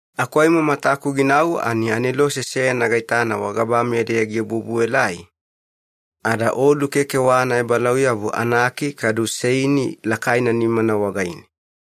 Aku aimo mataku ginau ani anelose seyana gaitana wagabameya-deya giobuobuelai, ada olu keke wa anaebalauyabu anaki kadu seini lakaina nimana wagaine.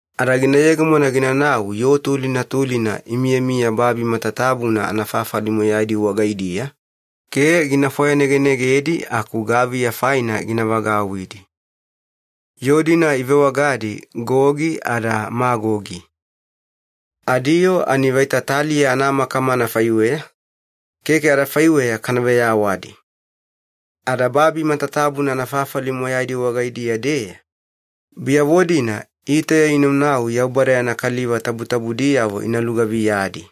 Ada gina yegemona ginanau yoo tulina tulina imiyamiya babi matatabuna anafafali moyaidi wagaidiya, ke gina fwayanegenegedi aku gaviya faina gina vagauwidi. Yoo-dina ivewagadi Gogi ada Magogi. Adiyoo ani vaita taliya anamakama anafaiweya, keke adafaiweya kana veyawadi. Ada babi matatabuna anafafali moyaidi wagaidiya-deya, biyavo-dina itauya inaunau Yaubada yana kaliva tabutabudiyavo ina lugaviyadi.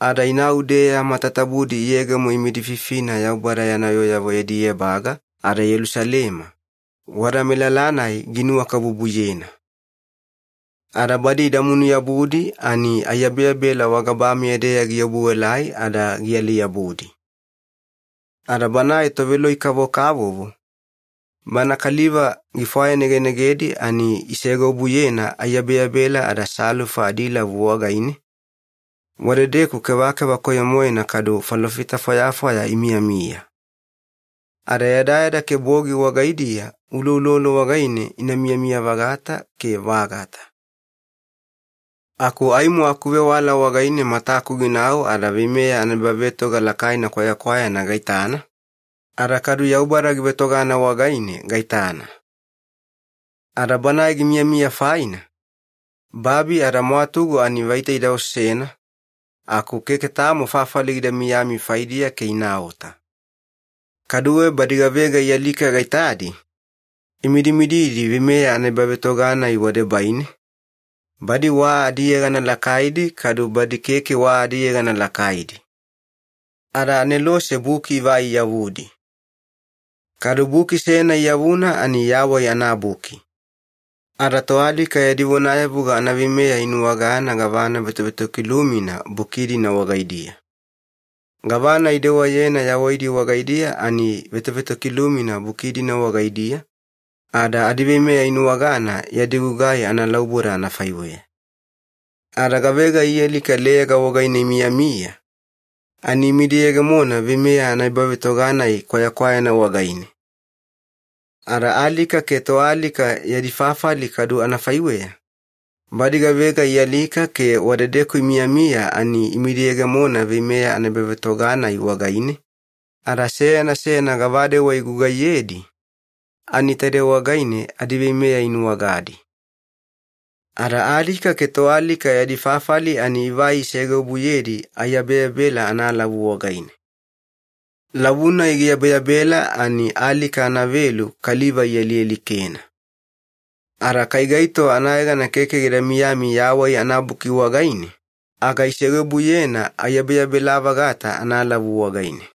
Ada inau-deeya matatabudi iyegemo imidififina Yaubada yana yooyavo yadi ebaga, ada Yelusalema, wada melala-nai ginuwakabubuyena. Ada badi idamunu-yabudi, ani aiyabeyabela wagabameya-deya giobuelai ada gialai-yabudi. Ada banae toveloi-kavokavovo, bana kaliva gifwayanegenegedi ani isegeobuyena aiyabeyabela ada salufa adilavu wagaine, wadedeku kevakeva koyo-moena kadu falofita fwayafwaya imiyamiya. Ada yadayada ke bogi wagaidiya uloulolo wagaine ina miyamiya-vagata ke vagata. Aku aimo akuvewala wagaine mataku ginau ada veimeya anaebavetoga lakaina kwayakwayana gaitana, ada kadu Yaubada givetogana wagaine gaitana. Ada Banae gimiyamiya faina, babi ada mwatugu ani vaita ida osena, aku keke tamo fafali gida miyami faidiya ke inaota. Kaduwe badi gavega ialika gaitadi, imidimididi veimeya anaebavetoga-nai wadebaine, badi wa adiyegana lakaidi kadu badi keke wa adiyegana lakaidi. Ada anelose buki ivai iyavudi. Kadu buki seyana iyavuna ani Yawai anaBuki. Ada toalika yadi vonayavuga anaveimeya inuwagana gavana vetovetokilumina buki-dina wagaidiya. Gavana idewayena yawaidi wagaidiya ani vetovetokilumina buki-dina wagaidiya, ada adiveimeya inuwagana yadi gugai analauboda anafaiweya. Ada gavega ialika leyaga wagaine imiyamiya, ani imidiyegemona veimeya anaebavetoga-nai kwayakwayana wagaine. Ada Alika ke Toalika Yadi Fafali kadu anafaiweya, badi gavega ialika ke wadedeku imiyamiya ani imidiyegemona veimeya anaebavetoga-nai wagaine, ada seyana seyana gavadewa igugaiyedi, ani taide wagaine adiveimeya inuwagadi. Ada Alika ke Toalika Yadi Fafali ani ivai isegeobuyedi aiyabeyabela analavu wagaine. Lavu-nai giyabeyabela ani alika anavelu kaliva ialialikena. Ada kai gaito anayegana keke gida miyami Yawai anaBuki wagaine, aga isegeobuyena aiyabeyabela-vagata analavu wagaine.